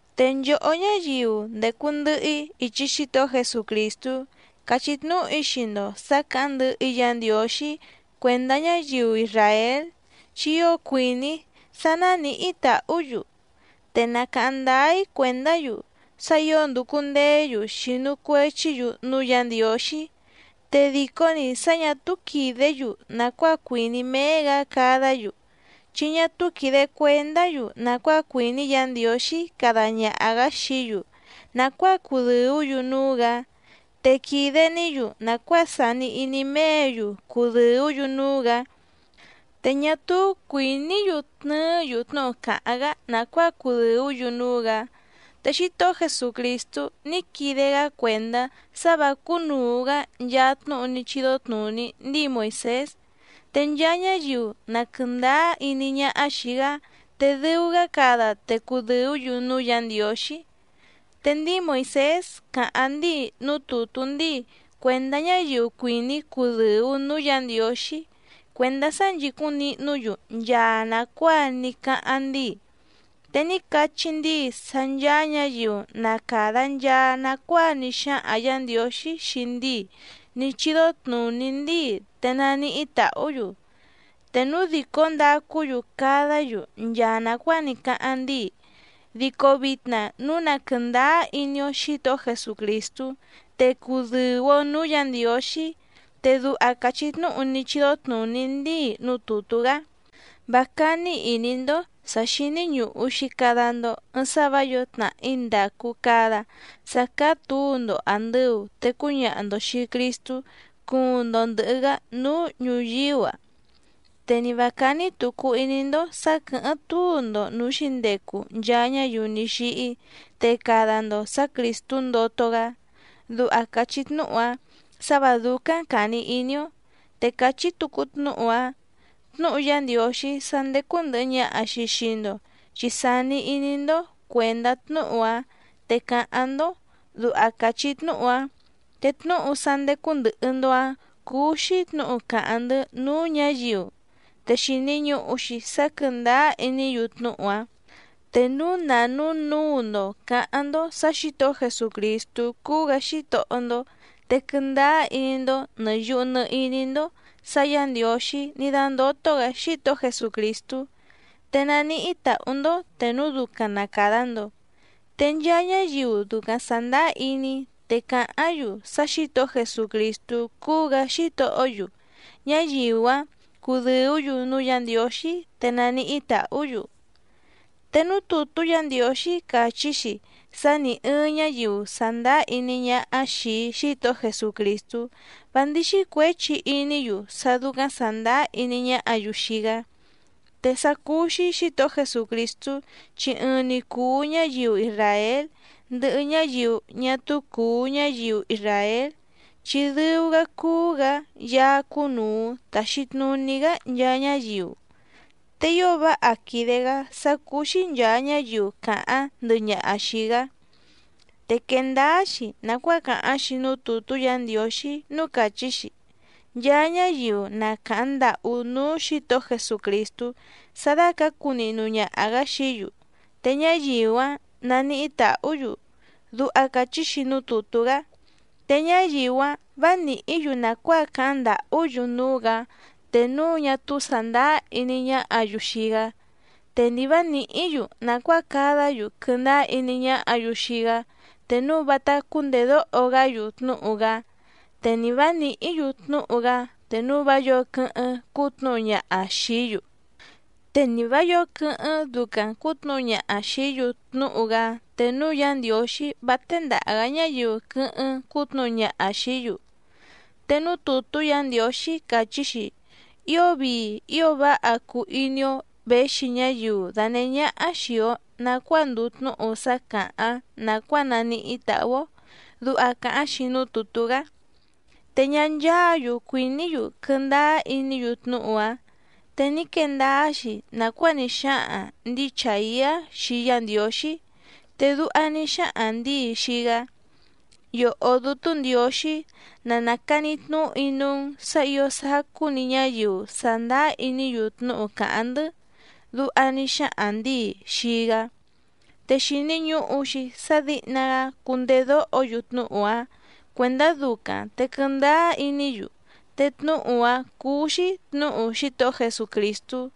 Te nchòhó ñáyiu ndècu ndɨhɨ‑í ichi Xítohó Jesucrìstú càchí tnúhu‑í xii‑ndo sǎ cǎháⁿ ndɨhɨ‑í Yǎ Ndiǒxí cuèndá ñáyiu isràél, chi ío cuìní‑í sá nánìhí tàhú‑yu. Te na càháⁿ ndáá‑í cuèndá‑yu sá ǐo ndùcu ndeé‑yu xìnu cuechí‑yu núú Yǎ Ndiǒxí, te dìcó‑ni sá ñà túú quìdé‑yu nàcuáa cuìní méé‑gǎ cadá‑yu. Chi ñá túú quìde cuendá‑yu nàcuáa cuìní Yǎ Ndiǒxí cada ñaha‑gǎ xií‑yu nàcuáa cudɨ̀ú‑yu núú‑gǎ, te quìde‑ní‑yu nàcuáa sàni iní méě‑yu cudɨ̀ú‑yu núú‑gǎ te ñá túú cuìní‑yu tnɨɨ́‑yu tnúhu càháⁿ‑gá nàcuáa cudɨ̀ú‑yu núú‑gǎ. Te Xítohó Jesucrìstú ní quide‑gá cuèndá sá vǎ cúnùu‑gá nchaa tnúhu ní chídó tnùní ndíi Moìsés, te nchaa ñáyiu na quɨ̀ndáá iní ñáhá xìi‑gá te dɨu‑gá cada te cudɨ̀ú‑yu núú Yǎ Ndiǒxí. Te ndíi Moìsés càháⁿ ndíi núú tùtú ndíi cuèndá ñáyiu cuìní cudɨ̀u núú Yǎ Ndiǒxí cuèndá sá nchìcúⁿ nihnú‑yu nchaa nàcuáa ní cáháⁿ ndíi. Te ní cachí ndíi sá ncháá ñǎyiu na càda nchaa nacuáa ní xáhaⁿ Yǎ Ndiǒxí xii ndíi ní chídó tnùní ndíi te naníhí tàhú‑yu, te núu dìcó ndacú‑yu cadá‑yu nchaa nàcuáa ní cáháⁿ ndíi. Dico vitna núu na quɨ̀ndáá iní‑ó Xǐtohó Jesucrìstú, te cudɨ̀u‑o núú Yǎ Ndiǒxí. Te duha càchí tnúhu ní chídó tnùní ndíi núú tùtú‑gá: “Vá cání ìní‑ndó sǎ xíní ñùhu‑xi cada‑ndo ɨɨⁿ sá vǎ yǒo tnàhí ndàcu cada sá cáá tǔu‑ndo àndɨu te cúñaha‑ndo xìi Cristú cuuⁿ‑ndo ndɨ̀hɨ‑gá núú ñùyíú‑a. Te ni vǎ cání tùcu iní‑ndó sǎ quɨ̀hɨ́ⁿ túu‑ndo nǔú xǐndecu nchaa ñáyiu ní xíhí te cada‑ndo sǎ Crìstú ndoto‑gá”, duha càchí tnúhu‑áⁿ sǎ vǎ dúcáⁿ càni iní‑ó. Te càchí tucu tnúhu‑áⁿ: “Tnúhu Yá Ndiǒxí sá ndécú ndɨ̀hɨ ñaha‑xi xii‑ndo chi sàni iní‑ndó cuèndá tnúhu‑áⁿ te càháⁿ‑ndó”, duha càchí tnúhu‑áⁿ. Te tnúhu sá ndécú ndɨ̀hɨ‑ndo‑áⁿ cúú‑xí tnǔhu càháⁿ‑ndɨ́ núú ñǎyiu, te xìni ñuhu‑xi sá quɨ̀ndáá iní‑yu tnúhu‑áⁿ. Te núu na nǔnuu‑ndo cǎháⁿ‑ndó sǎ Xǐtohó Jesucrìstú cúú‑gǎ Xítohó‑ndó, te quɨndáá iní‑ndó nɨ̀ yuhu nɨ iní‑ndó sǎ Yǎ Ndiǒxí ní dándótó‑gǎ Xítohó Jesucrìstú, te naníhí tàhú‑ndó te núu ducaⁿ na càda‑ndo. Te nchaa ñáyiu ducaⁿ sàndáá iní te cáháⁿ‑yu sá Xǐtohó Jesucrìstú cúú‑gǎ Xítohó‑yu, ñáyiu‑áⁿ cúdɨ̀ú‑yu núú Yǎ Ndiǒxí te nàníhí tàhú‑yu. Te núú tùtú Yǎ Ndiǒxí càchí‑xi sá nì ɨɨⁿ ñáyiu sàndáá iní ñáhá xìi Xítohó Jesucrìstú vá ndíxí cuěchi iní‑yu sá dúcáⁿ sàndáá iní ñáhǎ‑yu xii‑gá. Te sá cúú‑xí Xǐtohó Jesucrìstú chi ɨɨⁿ‑ni cùu ñáyiu isràél ndɨhɨ ñáyiu ñá túú cùu ñáyiu isràél, chi dɨu‑gá cúú‑gǎ Yaá cúnùu taxi tnuní‑gá nchaa ñáyiu, te ío váha quìde‑gá sá cúú‑xí nchàa ñáyiu càháⁿ ndɨhɨ ñaha xìi‑gá. Te quèe ndáá‑xi nàcuáa càháⁿ‑xi núú tùtú Yǎ Ndiǒxí núú càchí‑xi: “Nchaa ñáyiu na càháⁿ ndàhú núú Xǐtohó Jesucrìstú sá dácǎcu nihnu ñaha‑gǎ xií‑yu, te ñáyiu‑áⁿ naníhí tàhú‑yu”, duha càchí‑xi núú tùtú‑gá. Te ñáyiu‑áⁿ vǎ nìhí‑yu nàcuáa cáháⁿ ndàhú‑yu núú‑gǎ te núu ñá túú sàndáá iní ñáhǎ‑yu xii‑gá, te ni vǎ nìhí‑yu nàcuáa cadá‑yu quɨndáá iní ñáhǎ‑yu xii‑gá te núu vátá cúndèdóho‑gá‑yu tnúhu‑gá, te ni vǎ nìhí‑yu tnúhu‑gá te núu vá yǒo quɨ́hɨ́ⁿ cútnuhu ñaha xìí‑yu. Te ni vǎ yǒo quɨ́hɨ́ⁿ ducaⁿ cǔtnuhu ñaha xìí‑yu tnúhu‑gá te núu Yá Ndiǒxí vá téndàha‑gá ñáyiu quɨ́hɨ́ⁿ cútnuhu ñaha xìí‑yu. Te núú tùtú Yǎ Ndiǒxí càchí‑xi: “Ío vii ío váha cùu iní‑ó věxi ñáyiu dànehé ñáhá xìi‑o nacuáa ndùu tnúhu sá càháⁿ nàcuáa naníhí tàhú‑ó”, duha càháⁿ‑xi núú tùtú‑gá. Te ñá ncháǎ‑yu cuìní‑yu quɨndáá iní‑yu tnúhu‑áⁿ. Te ní quee ndáá‑xi nàcuáa ní xáhaⁿ ndǐi Chàiá xii Yá Ndiǒxí te duha ní xáhaⁿ ndǐi xii‑gá: “Yòhó Dútú Ndiǒxí na nàcani tnúhu‑í núú‑n sǎ ǐo sacú‑ni ñáyiu sàndáá iní‑yu tnúhu càháⁿ‑ndɨ́”, duha ní xáhaⁿ ndǐi xii‑gá. Te xìni ñuhu‑xi sá dǐhna‑gá cundedóho‑yu tnúhu‑áⁿ cuèndá ducaⁿ te quɨndáá iní‑yu, te tnúhu‑áⁿ cúú‑xí tnǔhu Xítohó Jesucrìstú.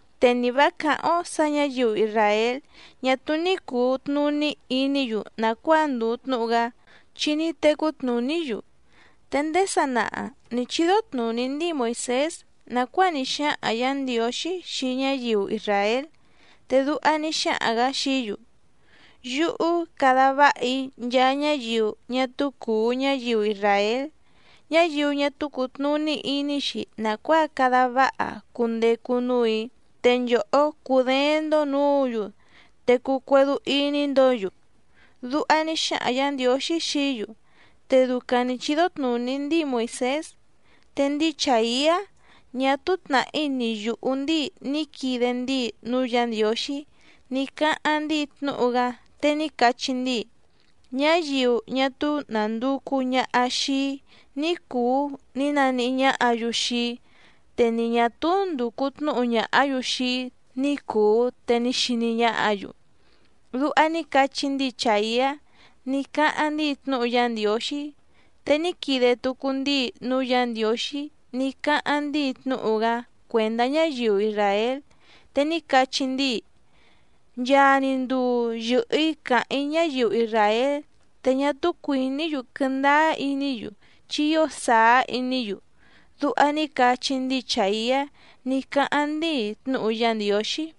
Te ni vǎ càháⁿ‑ó sǎ ñǎyiu isràél ñá túú ní cùu tnuní iní‑yu nàcuáa ndùu tnúhu‑gá chi ní tecú tnùní‑yu. Te ndéé sanaha nǐ chídó tnùní ndíi Moìsés nàcuáa ní xáhaⁿ Yǎ Ndiǒxí xii ñáyiu isràél, te duha ní xáhaⁿ‑gǎ xií‑yu: Yúhú cada váha‑í nchaa ñáyiu ñá túú cùu ñáyiu isràél, ñáyiu ñá túú cùtnuní iní‑xi nàcuáa cada váha cundecu núù‑í, te nchòhó cudééⁿ‑ndó nǔǔ‑yu te cuu cuédú íní‑ndǒ‑yu. Duha ní xáhaⁿ Yǎ Ndiǒxí xií‑yu te ducaⁿ nǐ chídó tnùní ndíi Moìsés. Te ndíi Chàiá ñá túú tnàhí ni yùhú ndíi ní quide ndíi núú Yǎ Ndiǒxí ní cáháⁿ ndíi tnúhu‑gá, te ní cachí ndíi: Ñáyiu ñá túú nànducu ñaha xii‑í ní cùu ní naníhí ñáhǎ‑yu xii‑í, te ni ñà túú ndùcu tnúhu ñàhá‑yu xii‑í ní cùu te ní xiní ñáhǎ‑yu. Duha ní cachí ndíi Chàiá ní cáháⁿ ndíi tnúhu Yá Ndiǒxí. Te ní quide tucu ndíi núú Yǎ Ndiǒxí ní cáháⁿ ndíi tnúhu‑gá cuèndá ñáyiu isràél, te ní cachí ndíi: “Nchaa‑ni nduu yɨ̀hɨ‑í càháⁿ‑í ñáyiu isràél te ñá túú cuìní‑yu quɨndáá iní‑yu chi ío sàá iní‑yu”, duha ní cachí ndíi Chàiá ní cáháⁿ ndíi tnúhu Yá Ndiǒxí.